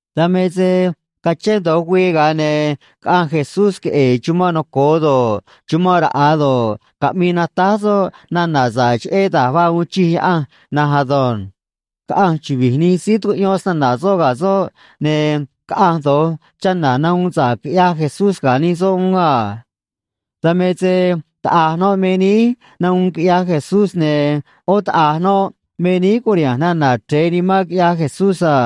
Dan me se cachén do̱j güii, ga̱a ne̱ caꞌanj Jesús queꞌe̱e̱ chumanꞌ noco̱o do̱ꞌ, chumanꞌ raꞌa̱ do̱ꞌ, caꞌmii natáj soꞌ nana̱ sa̱ꞌ cheꞌé da̱j vaa uun chij Yaꞌanj na̱nj ado̱nj. Caꞌanj chuvi̱j nij síí tucuꞌyón snana̱ soꞌ ga̱ soꞌ, ne̱ caꞌanj do̱j chana̱ nahuun sa̱ꞌ quiꞌyaj Jesús ga̱ nij soꞌ uún a. Dan me se taꞌa̱j noꞌ me níí nahuun quiꞌyaj Jesús, ne̱ ꞌó taꞌa̱j noꞌ me níí curiha̱nj nana̱ chre̱e nimán quiꞌyaj Jesús a.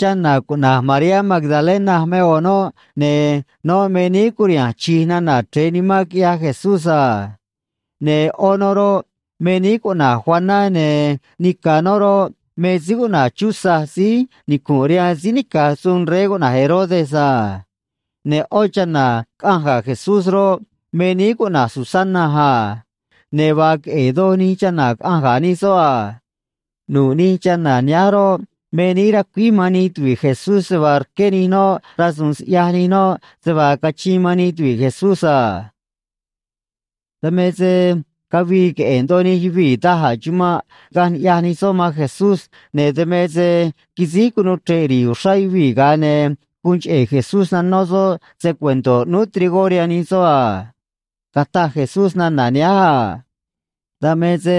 Chana̱ cuꞌna̱j Mariá Magdalena me ꞌo̱ noꞌ, ne̱ noꞌ me níí curiha̱nj chi̱j nana̱ chre̱e nimán quiꞌyaj Jesús a. Ne̱ ꞌó noꞌ roꞌ, me níí cuꞌna̱j Juaná, ne̱ nica̱ noꞌ roꞌ, me síí cuꞌna̱j Chuza síí nicu̱nꞌ rihaan síí nica̱j suun rey cuꞌna̱j Herodes a. Ne̱ ꞌó chana̱ caꞌanj ga̱ Jesús roꞌ, me níí cuꞌna̱j Susana a. Ne̱ vaa queꞌe̱e̱ doj nij chana̱ caꞌanj ga̱ nij soꞌ a. Nu̱ꞌ nij chana̱ nihánj roꞌ, me níí racuíj man nij tuvi̱ꞌ Jesús se vaa rqué nij noꞌ rasu̱u̱n siꞌyaj nij noꞌ se vaa cachiin man nij tuvi̱ꞌ Jesús a. Dan me se cavii queꞌe̱e̱ ndoꞌo nij yuvii̱ da̱j a̱ chumanꞌ, caꞌanj ni̱ꞌyaj nij soꞌ man Jesús, ne̱ dan me se quisíj cunuu chre̱ꞌ ri̱i̱ uxrá yuvii̱, ga̱a ne̱ guun cheꞌe̱ Jesús nanó soꞌ se‑cuento̱ ꞌnúú trigó rihaan nij soꞌ a. Cataj Jesús nana̱ nihánj a: ―Dan me se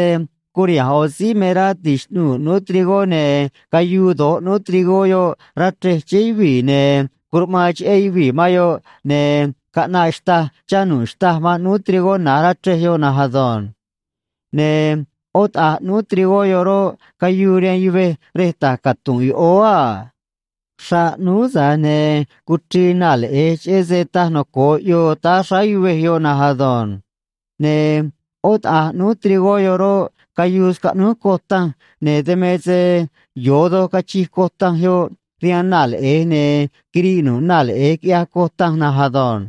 curiha̱nj ꞌo̱ síí me rá ti̱xꞌnuu̱ ꞌnúú trigó, ne̱ cayuu do̱j ꞌnúú trigó yoꞌ rá chrej chéé yuvii̱, ne̱ curuꞌmaan cheꞌé yuvii̱ man yoꞌ, ne̱ caꞌnaꞌ xtâj, chá nu̱ꞌ xtâj man ꞌnúú trigó na̱j rá chrej yoꞌ na̱nj ado̱nj. Ne̱ ꞌó taꞌa̱j ꞌnúú trigó yoꞌ roꞌ, cayuu rihaan yuvej rej ta̱j catu̱nꞌ yoꞌóó a. Xraꞌ ꞌnúú, tza̱j ne̱ cuchrii naa̱ leꞌe̱j cheꞌé se taj noco̱o ꞌyoo táá xráá yuvej yoꞌ na̱nj ado̱nj. Ne̱ ꞌó taꞌa̱j ꞌnúú trigó yoꞌ roꞌ, cayuu scaꞌnúj coj tanj, ne̱ dan me se yo̱o doj cachij coj tanj yoꞌ rihaan naa̱ leꞌe̱j, ne̱ quiriꞌ nu̱ꞌ naa̱ leꞌe̱j, quiꞌyaj coj tanj na̱nj ado̱nj.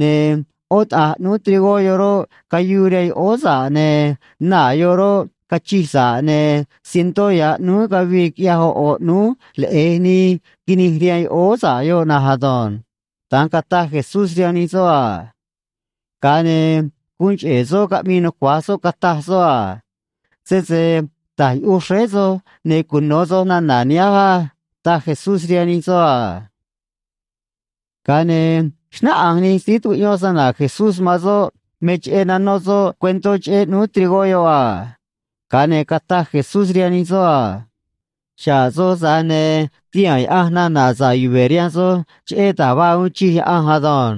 Ne̱ ꞌó taꞌa̱j ꞌnúú trigó yoꞌ roꞌ, cayuu rihaan yoꞌóó sa̱ꞌ, ne̱ naa̱ yoꞌ roꞌ, cachij sa̱ꞌ, ne̱ cientó ya̱ ꞌnúú cavii, quiꞌyaj ꞌo̱ ꞌo̱ ꞌnúú leꞌe̱j nii quinij rihaan yoꞌóó sa̱ꞌ yoꞌ na̱nj ado̱nj ―da̱nj cataj Jesús rihaan nij soꞌ a. Ga̱a ne̱ guun cheꞌe̱ soꞌ caꞌmii nucua̱j soꞌ, cataj soꞌ a: ―Sese ta̱j yuꞌuj xréé soj, ne̱ cuno̱ soj nana̱ nihánj á ―taj Jesús rihaan nij soꞌ a. Ga̱a ne̱ xnáꞌanj nij síí tucuꞌyón snana̱ Jesús man soꞌ me cheꞌé nanó soꞌ cuentó cheꞌé ꞌnúú trigó yoꞌ a. Ga̱a ne̱ cataj Jesús rihaan nij soꞌ a: ―Xa̱ꞌ soj, tza̱j ne̱ tihaa̱n Yaꞌanj nana̱ sa̱ꞌ yuve̱ rihaan soj cheꞌé da̱j vaa uun chij Yaꞌanj ado̱nj.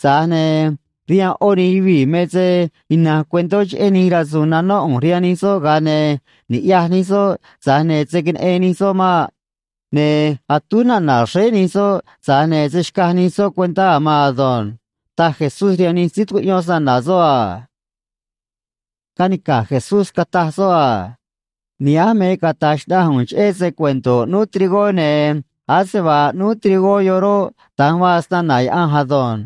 Tza̱j ne̱ rihaan ꞌó nij yuvii̱ me se ina̱nj cuentó cheꞌé nij rasu̱u̱n nanó ꞌu̱nj rihaan nij soꞌ, ga̱a ne̱: Ni̱ꞌyaj nij soꞌ, tza̱j ne̱ se̱ queneꞌen nij soꞌ maꞌ. Ne̱ atúj nana̱ xréé nij soꞌ, tza̱j ne̱ se̱ xcaj nij soꞌ cuentá a̱ maan ado̱nj ―taj Jesús rihaan nij síí tucuꞌyón snana̱ soꞌ a. Canica̱j Jesús, cataj soꞌ a: ―Nihánj me cata̱j xnaꞌanj ꞌu̱nj cheꞌé se‑cuento̱ ꞌnúú trigó, ne̱ ase vaa ꞌnúú trigó yoꞌ roꞌ, da̱nj vaa snana̱ Yaꞌanj ado̱nj.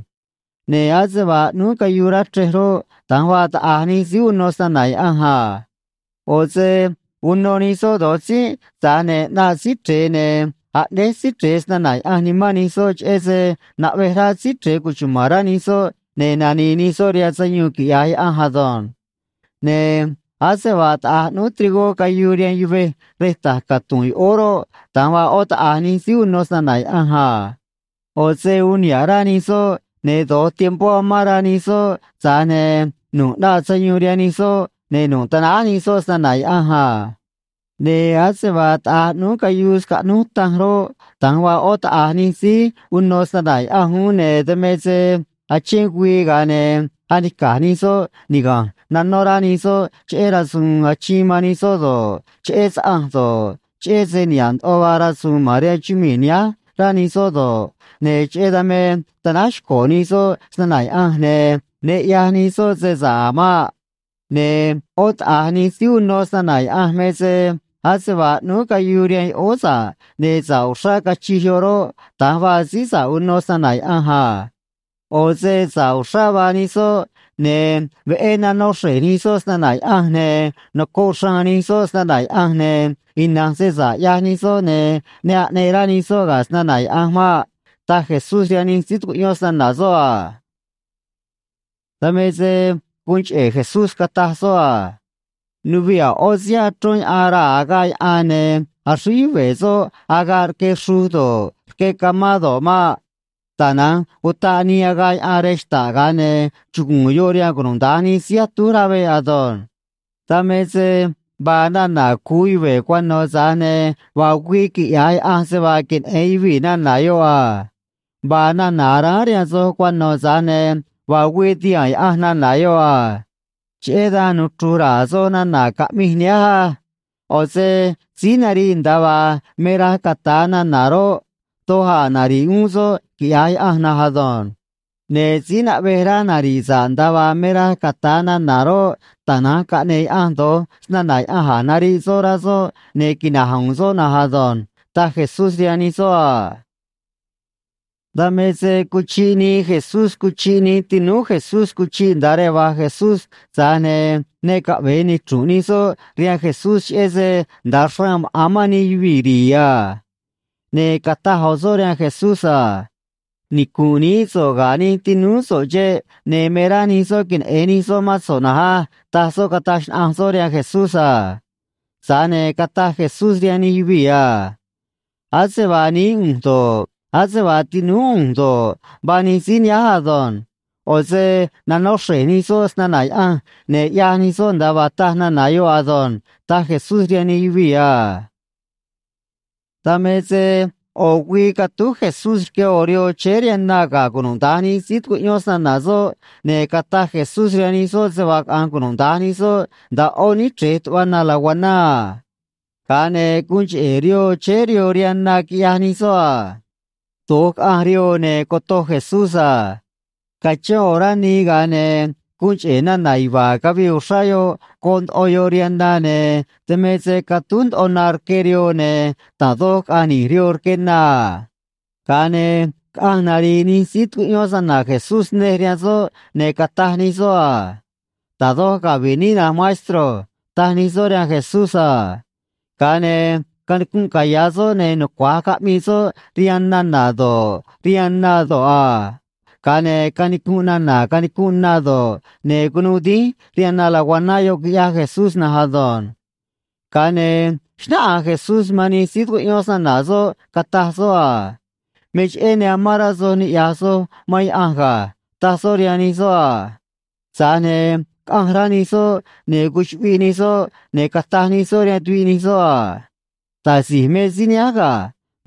Ne̱ ase vaa ꞌnúú cayuu rá chrej roꞌ, da̱nj vaa taꞌa̱j nij síí uno snana̱ Yaꞌanj a. ꞌO̱ se uno nij soꞌ do̱j tzínꞌ, tza̱j ne̱ ꞌnaꞌ Síí Chre̱e, ne̱ aꞌnéj Síí Chre̱e snana̱ Yaꞌanj nimán nij soꞌ cheꞌé se naꞌvej rá Síí Chre̱e cuchuma̱n rá nij soꞌ ne̱ nani̱i̱ nij soꞌ rihaan sayuun quiꞌya̱j Yaꞌanj ado̱nj. Ne̱ ase vaa taꞌa̱j ꞌnúú trigó cayuu rihaan yuvej rej ta̱j catu̱nꞌ yoꞌóó roꞌ, da̱nj vaa ꞌó taꞌa̱j nij síí uno snana̱ Yaꞌanj a. ꞌO̱ se uun niha̱ꞌ rá nij soꞌ, ne̱ do̱j tiempó amán rá nij soꞌ, tza̱j ne̱ nu̱ꞌ ꞌnaꞌ sayuun rihaan nij soꞌ, ne̱ nu̱ꞌ tanáj nij soꞌ snana̱ Yaꞌanj a. Ne̱ ase vaa taꞌa̱j ꞌnúú cayuu scaꞌnúj tanj roꞌ, da̱nj vaa ꞌó taꞌa̱j nij síí uno snana̱ Yaꞌanj uún, ne̱ dan me se achén güii, ga̱a ne̱ anica̱j nij soꞌ niga̱nj nanó rá nij soꞌ cheꞌé rasu̱u̱n achiin man nij soꞌ do̱ꞌ, cheꞌé saꞌanj do̱ꞌ, cheꞌé se niha̱ꞌ ndoꞌo vaa rasu̱u̱n ma̱n rihaan chumii̱ nihánj rá nij soꞌ do̱ꞌ, ne̱ cheꞌé dan me tanáj xco̱ nij soꞌ snana̱ Yaꞌanj, ne̱ ne ꞌyaj nij soꞌ se sa̱ꞌ a̱ maꞌ. Ne̱ ꞌó taꞌa̱j nij síí uno snana̱ Yaꞌanj me se ase vaa ꞌnúú cayuu rihaan yoꞌóó sa̱ꞌ ne̱ sa̱ꞌ uxrá cachij yoꞌ roꞌ, da̱nj vaa síí sa̱ꞌ uno snana̱ Yaꞌanj a. ꞌO̱ se sa̱ꞌ uxrá vaa nij soꞌ, ne̱ veꞌé nanó xre̱j nij soꞌ snana̱ Yaꞌanj, ne̱ nocoꞌ xraan nij soꞌ snana̱ Yaꞌanj, ne̱ ina̱nj se sa̱ꞌ ꞌyaj nij soꞌ, ne̱ ne aꞌneꞌ rá nij soꞌ ga̱ snana̱ Yaꞌanj maꞌ ―taj Jesús rihaan nij síí tucuꞌyón snana̱ soꞌ a. Dan me se guun cheꞌe̱ Jesús cataj soꞌ a: ―Nuviꞌ a̱ ꞌó síí achrón yaꞌan raa̱ agaꞌ yaꞌan, ne̱ axríj yuve̱ soꞌ agaꞌ rque xruj do̱ꞌ, rque camá do̱ꞌ maꞌ. Tana̱nj utaꞌ nii agaꞌ yaꞌan rej xta̱ꞌ, ga̱a ne̱ chugu̱u̱n yoꞌ rihaan cunuda̱nj nij síí atúj rá veꞌ ado̱nj. Dan me se vaa nana̱ cu̱u yuve̱ cuano̱, tza̱j ne̱ vaa güii quiꞌya̱j Yaꞌanj se vaa queneꞌe̱n yuvii̱ nana̱ yoꞌ a. Vaa nana̱ aráán rihaan soj cuano̱, tza̱j ne̱ vaa güii ti̱haa̱n Yaꞌanj nana̱ yoꞌ a. ’Cheꞌé dan nuchru̱j ra̱a̱ soj nana̱ caꞌmij nihánj á. ꞌO̱ se síí nariꞌ nda̱a vaa me raj cata̱a nana̱ roꞌ, doj a̱ nari̱ꞌ uún soꞌ quiꞌya̱j Yaꞌanj na̱nj ado̱nj. Ne̱ síí naꞌvej rá nari̱ꞌ sa̱ꞌ nda̱a vaa me raj cata̱a nana̱ roꞌ, tana̱nj caꞌne̱e̱ Yaꞌanj do̱j snana̱ Yaꞌanj a̱j nariꞌ soꞌ rá soꞌ, ne̱ quina̱j u̱u̱n soꞌ na̱nj ado̱nj ―taj Jesús rihaan nij soꞌ a. Dan me se cuchiꞌ nii Jesús cuchiꞌ nij tinúú Jesús cuchiꞌ nda̱a rej va̱j Jesús, tza̱j ne̱ ne caꞌve̱e nichru̱nꞌ nij soꞌ rihaan Jesús, cheꞌé se nda̱a xraan maꞌa̱n mán nij yuvii̱ ri̱i̱ a. Ne̱ cataj ꞌo̱ soꞌ rihaan Jesús a: ―Nicu̱nꞌ nií so̱ꞌ ga̱ nij tinúú so̱ꞌ xeꞌ, ne̱ me rá nij soꞌ queneꞌe̱n nij soꞌ mán so̱ꞌ na̱nj á ―taj soꞌ, cataj xnaꞌanj soꞌ rihaan Jesús a. Tza̱j ne̱ cataj Jesús rihaan nij yuvii̱ a: ―Ase vaa nií ꞌu̱nj do̱ꞌ, ase vaa tinúú ꞌu̱nj do̱ꞌ, vaa nij síí nihánj ado̱nj. ꞌO̱ se nanó xre̱j nij soꞌ snana̱ Yaꞌanj, ne̱ ꞌyaj nij soꞌ nda̱a vaa taj nana̱ yoꞌ ado̱nj ―taj Jesús rihaan nij yuvii̱ a. Dan me se ꞌo̱ güii catúj Jesús rque ꞌo̱ rihoo chéé rihaan na ga̱ cunuda̱nj nij síí tucuꞌyón snana̱ soꞌ, ne̱ cataj Jesús rihaan nij soꞌ se vaa caꞌa̱nj cunuda̱nj nij soꞌ nda̱a ꞌó níchrej tuꞌva na laguaná a. Ga̱a ne̱ guun cheꞌe̱ rihoo chéé rihoo rihaan na, quiꞌyaj nij soꞌ a. Do̱j caꞌanj rihoo, ne̱ cotoj Jesús a. Cachén ꞌo̱ orá nii, ga̱a ne̱ guun cheꞌe̱ nana̱ yuva̱a̱ cavii uxrá yoꞌ goꞌ ndoꞌo yoꞌ rihaan na, ne̱ dan me se catúj ndoꞌo na rque rihoo, ne̱ da̱j doj caꞌa̱nj ni̱j rihoo rque na a. Ga̱a ne̱ caꞌanj nari̱i̱ nij síí tucuꞌyón snana̱ Jesús nej rihaan soꞌ, ne̱ cataj nij soꞌ a: ―Da̱j doj cavi̱ꞌ níꞌ, na̱nj maestro ―taj nij soꞌ rihaan Jesús a. Ga̱a ne̱ canicunꞌ caya̱ soꞌ, ne̱ nucua̱j caꞌmii soꞌ rihaan nana̱ do̱ꞌ, rihaan na do̱ꞌ a. Ga̱a ne̱ canicunꞌ nana̱ canicunꞌ na do̱ꞌ, ne̱ cunuu dínj rihaan na laguaná yoꞌ, quiꞌyaj Jesús na̱nj ado̱nj. Ga̱a ne̱ xnáꞌanj Jesús man nij síí tucuꞌyón snana̱ soꞌ, cataj soꞌ a: ―Me cheꞌé ne amán rá soj niꞌya̱j soj man Yaꞌanj ga̱ ―taj soꞌ rihaan nij soꞌ a. Tza̱j ne̱ caꞌanj rá nij soꞌ, ne̱ cuchuꞌviꞌ nij soꞌ, ne̱ cataj nij soꞌ rihaan tuviꞌ nij soꞌ a: ―Da̱j si̱j me síí nihánj ga̱.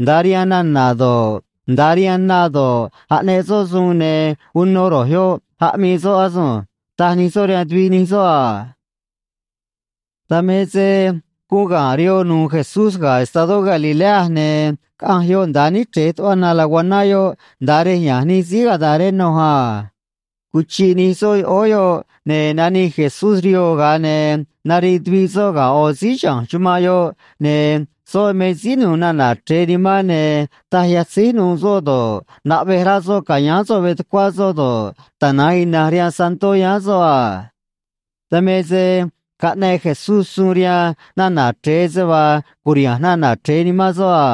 Nda̱a rihaan nana̱ do̱ꞌ, nda̱a rihaan na do̱ꞌ, aꞌneꞌ soꞌ suun, ne̱ uno ro̱j yoꞌ aꞌmii soꞌ asunj ―taj nij soꞌ rihaan tuviꞌ nij soꞌ a. Dan me se guun ga̱nꞌ rihoo nu̱u̱ Jesús ga̱ estadó Galilea, ne̱ caꞌanj yoꞌ nda̱a níchrej tuꞌva na laguaná yoꞌ, nda̱a rej ya̱nj nij síí “gadareno” a. Cuchiꞌ nij soꞌ yoꞌóó yoꞌ, ne̱ nanij Jesús rihoo, ga̱a ne̱ nariꞌ tuviꞌ soꞌ ga̱ ꞌo̱ síí chiha̱nj chumanꞌ yoꞌ, ne̱ soꞌ me síí nu̱u̱ nana̱ chre̱e nimán, ne̱ taj yatzíj nu̱u̱ soꞌ do̱ꞌ, naꞌvej rá soꞌ ca̱yáán soꞌ veꞌ tucuá soꞌ do̱ꞌ, tana̱nj ina̱nj rihaan santó yáán soꞌ a. Dan me se caꞌneꞌ Jesús suun rihaan nana̱ chre̱e se vaa cu̱riha̱nj nana̱ chre̱e nimán soꞌ a.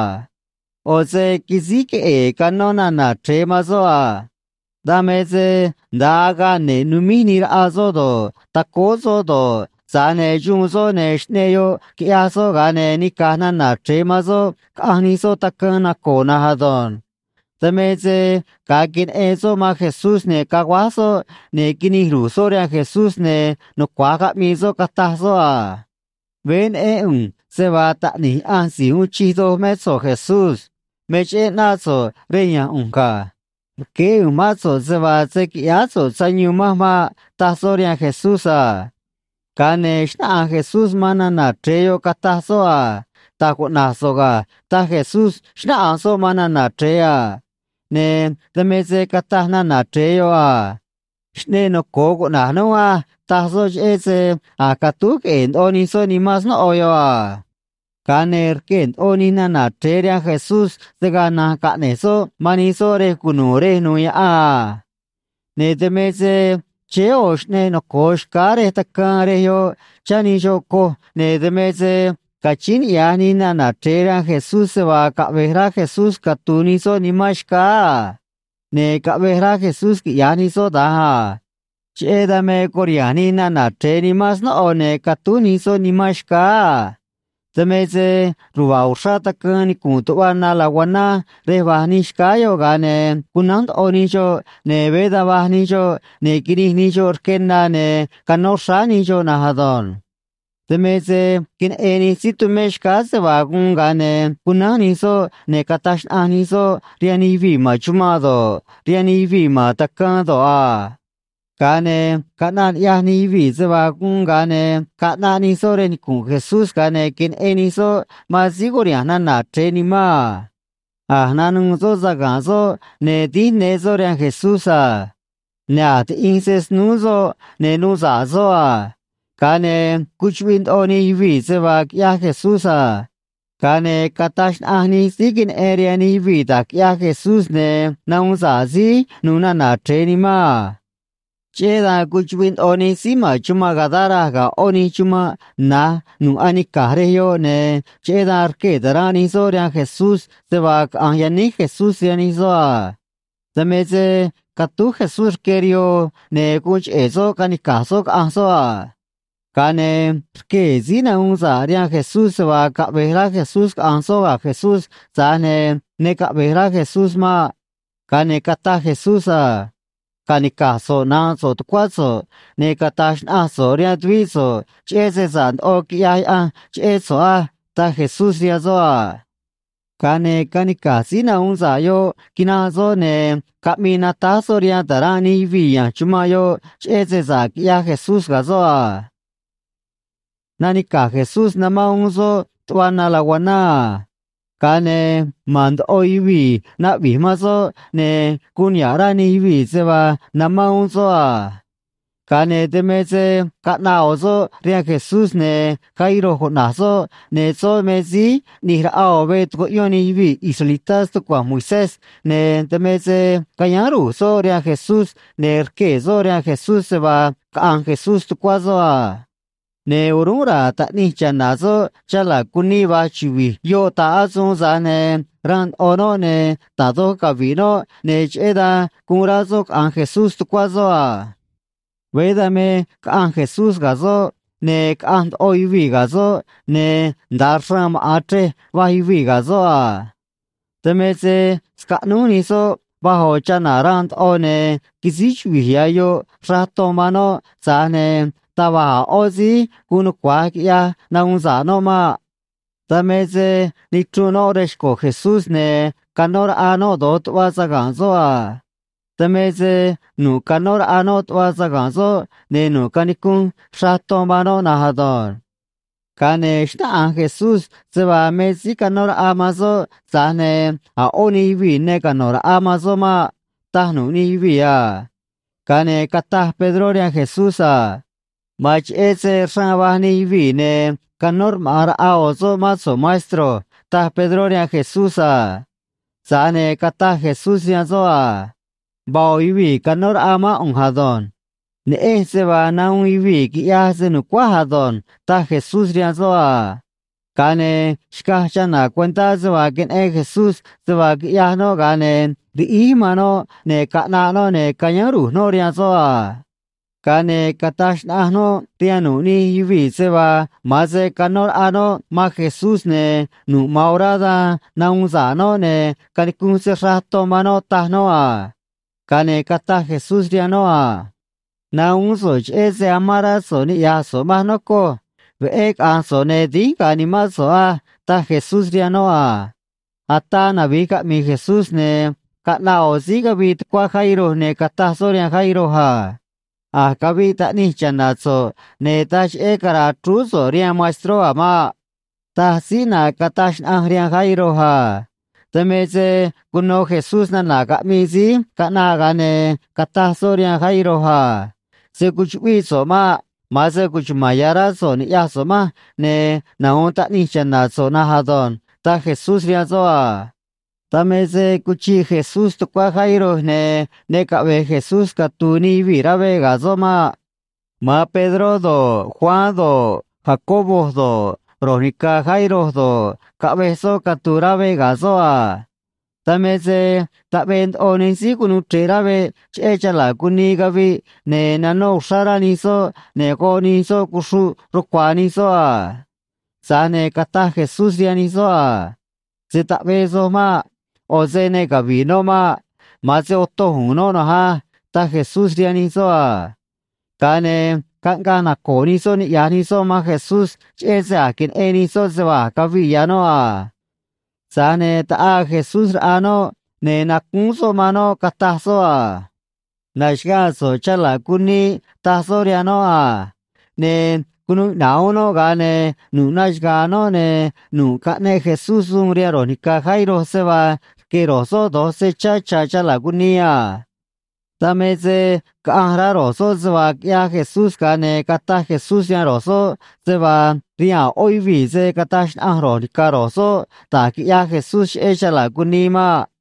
ꞌO̱ se quisíj queꞌe̱e̱ canó nana̱ chre̱e man soꞌ a. Dan me se nda̱a agaꞌ ne̱ꞌ numíj nii raꞌa soꞌ do̱ꞌ, tacóó soꞌ do̱ꞌ, tza̱j ne̱ xuun soꞌ, ne̱ xꞌneꞌ yoꞌ, quiꞌyaj soꞌ, ga̱a ne̱ nica̱j nana̱ chre̱e man soꞌ caꞌanj nij soꞌ tacaan naco̱o̱ na̱nj ado̱nj. Dan me se ga̱a queneꞌen soꞌ man Jesús, ne̱ caguáj soꞌ, ne̱ quinij ru̱j soꞌ rihaan Jesús, ne̱ nucua̱j caꞌmii soꞌ, cataj soꞌ a: ―Veé neꞌén ꞌu̱nj se vaa Taꞌni̱j Yaꞌanj Si̱j Uun Chij Doj mé so̱ꞌ, Jesús. Me cheꞌé ꞌnáꞌ so̱ꞌ rej ya̱nj ꞌu̱nj ga̱. Rqueé ꞌu̱nj mán so̱ꞌ se vaa se̱ quiꞌyáá so̱ꞌ sayuun manj maꞌ ―taj soꞌ rihaan Jesús a. Ga̱a ne̱ xnáꞌanj Jesús man nana̱ chre̱e yoꞌ, cataj soꞌ a: ―Da̱j cuꞌna̱j so̱ꞌ ga̱ ―taj Jesús, xnáꞌanj soꞌ man nana̱ chre̱e a. Ne̱ dan me se cataj nana̱ chre̱e yoꞌ a: ―Xꞌneꞌ noco̱o cuꞌna̱j núj á ―taj soꞌ cheꞌé se a̱j catúj queꞌe̱e̱ ndoꞌo nij soꞌ nimán snóꞌo yoꞌ a. Ga̱a ne̱ rquee̱ ndoꞌo nij nana̱ chre̱e rihaan Jesús se̱ gaa na̱nj caꞌne̱j soꞌ man nij soꞌ rej cunu̱u̱ rej nu̱u̱ yaꞌan a. Ne̱ dan me se chéé ꞌo̱ xꞌneꞌ noco̱o xcáá rej tacaan rej yoꞌ, chá nij xoꞌ coj, ne̱ dan me se cachíín niꞌya̱j nij nana̱ chre̱e rihaan Jesús se vaa caꞌve̱j rá Jesús catu̱u̱ nij soꞌ nimán xcáá a. Ne̱ caꞌvej rá Jesús quiꞌya̱j nij soꞌ da̱nj a. Cheꞌé dan me curiha̱nj nij nana̱ chre̱e nimán snóꞌo, ne̱ catúj nij soꞌ nimán xcáá a. Dan me se ruva̱a̱ uxrá tacaan nicu̱nꞌ tuꞌva na laguaná rej va̱j nij xcáá yoꞌ, ga̱a ne̱ cunánj ndoꞌo nij xoꞌ, ne̱ veé da̱nj vaj nij xoꞌ, ne̱ quinij nij xoꞌ rque na, ne̱ canó xráá nij xoꞌ na̱nj ado̱nj. Dan me se queneꞌen nij síí tumé xcáá se vaa guun, ga̱a ne̱ cunánj nij soꞌ ne̱ cataj xnaꞌanj nij soꞌ rihaan nij yuvii̱ ma̱n chumanꞌ do̱ꞌ, rihaan nij yuvii̱ ma̱n tacaan do̱ꞌ a. Ga̱a ne̱ caꞌnaꞌ ni̱ꞌyaj nij yuvii̱ se vaa guun, ga̱a ne̱ caꞌnaꞌ nij soꞌ rej nicu̱nꞌ Jesús, ga̱a ne̱ queneꞌen nij soꞌ man síí curiha̱nj nana̱ chre̱e nimán a. A̱j nanuû soꞌ saga̱nꞌ soꞌ, ne̱ dínj ne soꞌ rihaan Jesús a. Ne̱ a̱j tiꞌinj se snúú soꞌ, ne̱ nuu sa̱ꞌ soꞌ a. Ga̱a ne̱ cuchuꞌviꞌ ndoꞌo nij yuvii̱ se vaa quiꞌyaj Jesús a. Ga̱a ne̱ cataj xnaꞌanj nij síí queneꞌen rihaan nij yuvii̱ da̱j quiꞌyaj Jesús ne̱ nahuun sa̱ꞌ síí nu̱u̱ nana̱ chre̱e nimán a. Cheꞌé dan cuchuꞌviꞌ ndoꞌo nij síí ma̱n chumanꞌ Gadara ga̱ ꞌó nij chumanꞌ na̱j nu̱ꞌ anica̱j rej yoꞌ, ne̱ cheꞌé dan rquee̱ ta̱ranꞌ nij soꞌ rihaan Jesús se vaa caꞌa̱nj yaníj Jesús rihaan nij soꞌ a. Dan me se catúj Jesús rque rihoo, ne̱ guun cheꞌe̱ soꞌ canica̱j soꞌ caꞌa̱nj soꞌ a. Ga̱a ne̱ rquee̱ síí nahuun sa̱ꞌ rihaan Jesús se vaa caꞌve̱j rá Jesús caꞌa̱nj soꞌ ga̱ Jesús, tza̱j ne̱ ne caꞌve̱j rá Jesús maꞌ. Ga̱a ne̱ cataj Jesús a: ―Ca̱nica̱j so̱ꞌ nánꞌ so̱ꞌ tucuá so̱ꞌ, ne̱ cata̱j xnaꞌanj so̱ꞌ rihaan tuvíꞌ so̱ꞌ cheꞌé se sa̱ꞌ ndoꞌo quiꞌyaj Yaꞌanj cheꞌé so̱ꞌ á ―taj Jesús rihaan soꞌ a. Ga̱a ne̱ canica̱j síí nahuun sa̱ꞌ yoꞌ quinanꞌ soꞌ, ne̱ caꞌmii natáj soꞌ rihaan ta̱ranꞌ nij yuvii̱ ya̱nj chumanꞌ yoꞌ cheꞌé se sa̱ꞌ quiꞌyaj Jesús ga̱ soꞌ a. Nanica̱j Jesús, namán uún soꞌ tuꞌva na laguaná a. Ga̱a ne̱ ma̱n ndoꞌo yuvii̱ naꞌvi̱j man soꞌ, ne̱ guun niha̱ꞌ rá nij yuvii̱ se vaa namán uún soꞌ a. Ga̱a ne̱ dan me se caꞌnaꞌ ꞌo̱ soꞌ rihaan Jesús, ne̱ Jairo cuꞌna̱j soꞌ, ne̱ soꞌ me síí ꞌni̱j raꞌa ꞌo̱ veꞌ tucuꞌyón nij yuvii̱ israelitá stucua̱nj Moisés, ne̱ dan me se cayáán ru̱j soꞌ rihaan Jesús, ne̱ rquee̱ soꞌ rihaan Jesús se vaa caꞌa̱nj Jesús tucuá soꞌ a. Ne̱ o̱rúnꞌ ra̱a̱ taꞌnij cha̱na̱ soꞌ chala̱ cunii va̱j chuvi̱j yoꞌ ta̱ꞌ asuun, tza̱j ne̱ ranꞌ ndoꞌo noꞌ, ne̱ da̱j doj cavi̱ꞌ noꞌ, ne̱ cheꞌé dan guun rá soꞌ caꞌa̱nj Jesús tucuá soꞌ a. Veé dan me caꞌanj Jesús ga̱ soꞌ, ne̱ caꞌanj ndoꞌo yuvii̱ ga̱ soꞌ, ne̱ nda̱a xraan maꞌa̱n chrej va̱j yuvii̱ ga̱ soꞌ a. Dan me se scaꞌnúj nij soꞌ vaj ꞌo̱ chana̱ ranꞌ ndoꞌo, ne̱ quisíj chuvi̱j ya̱ yoꞌ xraꞌ ton man noꞌ, tza̱j ne̱ taj va̱j a̱ ꞌó síí guun nucua̱j quiꞌyaj nahuun sa̱ꞌ noꞌ maꞌ. Dan me se nichrunꞌ noꞌ rej xco̱ Jesús, ne̱ canó raꞌa noꞌ do̱j tuꞌva saga̱nꞌ soꞌ a. Dan me se nu̱ꞌ canó raꞌa noꞌ tuꞌva saga̱nꞌ soꞌ, ne̱ nu̱ꞌ canicunꞌ xraꞌ ton man noꞌ na̱nj ado̱nj. Ga̱a ne̱ xnáꞌanj Jesús se vaa me síí canó raꞌa man soꞌ, tza̱j ne̱ a̱ ꞌó nij yuvii̱ ne cano̱ raꞌa man soꞌ maꞌ, taj nu̱ꞌ nij yuvii̱ a. Ga̱a ne̱ cataj Pedró rihaan Jesús a: ―Ma̱an cheꞌé se xraan va̱j nij yuvii̱, ne̱ canó rmaꞌa̱n raꞌa ꞌo̱ soꞌ mán so̱ꞌ, maestro ―taj Pedró rihaan Jesús a. Tza̱j ne̱ cataj Jesús rihaan soꞌ a: ―Vaa ꞌo̱ yuvii̱ canó raꞌa mán ꞌu̱nj ado̱nj. Neꞌenj se vaa nahuun yuvii̱ quiꞌyaj se‑nu̱cuáj ado̱nj ―taj Jesús rihaan soꞌ a. Ga̱a ne̱ xcaj chana̱ cuentá se vaa queneꞌen Jesús se vaa quiꞌyaj noꞌ, ga̱a ne̱ riꞌíj man noꞌ, ne̱ caꞌnaꞌ noꞌ, ne̱ cayáán ru̱j noꞌ rihaan soꞌ a. Ga̱a ne̱ cataj xnaꞌanj noꞌ rihaan nu̱ꞌ nij yuvii̱ se vaa ma̱an se canó raꞌa noꞌ man Jesús, ne̱ nu̱ꞌ ma̱an orá dan nahuun sa̱ꞌ noꞌ ne̱ canicunꞌ se xraꞌ ton man noꞌ, taj noꞌ a. Ga̱a ne̱ cataj Jesús rihaan noꞌ a: ―Nahuún so̱ꞌ cheꞌé se amán rá so̱ꞌ niꞌya̱j so̱ꞌ manj, nocoj. Veꞌé caꞌa̱nj so̱ꞌ, ne̱ dínj ga̱a̱ nimán so̱ꞌ á ―taj Jesús rihaan noꞌ a. Ataa navi̱j caꞌmi̱i̱ Jesús, ne̱ caꞌnaꞌ ꞌo̱ síí cavii tucuá Jairo, ne̱ cataj soꞌ rihaan Jairo a: ―A̱j caviꞌ taꞌnij cha̱na̱ so̱ꞌ, ne̱ taj cheꞌé cara̱a̱ chrúú so̱ꞌ rihaan maestró a̱ maꞌ ―taj síí ꞌnaꞌ cataj xnaꞌanj rihaan Jairo a. Dan me se cuno Jesús nana̱ caꞌmii síí caꞌnaꞌ, ga̱a ne̱ cataj soꞌ rihaan Jairo a: ―Se̱ cuchuꞌvíꞌ so̱ꞌ maꞌ. Ma̱an se cuchuma̱n ya̱ rá so̱ꞌ ni̱ꞌyaj so̱ꞌ manj, ne̱ nahu̱un taꞌnij cha̱na̱ so̱ꞌ na̱nj ado̱nj ―taj Jesús rihaan soꞌ a. Dan me se cuchiꞌ Jesús tucuá Jairo, ne̱ ne caꞌve̱j Jesús catu̱u̱ nij yuvii̱ rá veꞌ ga̱ soꞌ maꞌ. Ma̱an Pedró do̱ꞌ, Juan do̱ꞌ, Jacobo do̱ꞌ, ro̱j ni̱ca̱ Jairo do̱ꞌ, caꞌvej soꞌ catu̱u̱ rá veꞌ ga̱ soꞌ a. Dan me se taꞌvee ndoꞌo nij síí cunuu chre̱ꞌ rá veꞌ cheꞌé chala̱ cunii caviꞌ, ne̱ nanó uxrá rá nij soꞌ, ne̱ goꞌ nij soꞌ cuxruꞌ rucua̱a̱ nij soꞌ a. Tza̱j ne̱ cataj Jesús rihaan nij soꞌ a: ―Se̱ taꞌvee soj maꞌ. ꞌO̱ se ne cavi̱ꞌ noꞌ maꞌ. Ma̱an se otoj u̱u̱n noꞌ na̱nj á ―taj Jesús rihaan nij soꞌ a. Ga̱a ne̱ caꞌngaꞌ naco̱o̱ nij soꞌ niꞌya̱j nij soꞌ man Jesús cheꞌé se a̱j queneꞌen nij soꞌ se vaa a̱j caviꞌ ya̱ noꞌ a. Tza̱j ne̱ taꞌaa Jesús raꞌa noꞌ, ne̱ nacúún soꞌ man noꞌ, cataj soꞌ a: ―Na̱xaga̱a̱ so̱ꞌ, chala̱ cunii ―taj soꞌ rihaan noꞌ a. Ne̱ cunuu iꞌna̱ꞌ uún noꞌ, ga̱a ne̱ nu̱ꞌ naxaga̱a̱ noꞌ, ne̱ nu̱ꞌ caꞌneꞌ Jesús suun rihaan ro̱j ni̱ca̱ Jairo se vaa rque̱ ro̱j soꞌ do̱j se chá cha̱ chala̱ cunii a. Dan me se caꞌanj rá ro̱j soꞌ se vaa quiꞌyaj Jesús, ga̱a ne̱ cataj Jesús rihaan ro̱j soꞌ se vaa rihaan a̱ ꞌó yuvii̱ se̱ cataj xnaꞌanj ro̱j ni̱ca̱ ro̱j soꞌ da̱j quiꞌyaj Jesús cheꞌé chala̱ cunii maꞌ.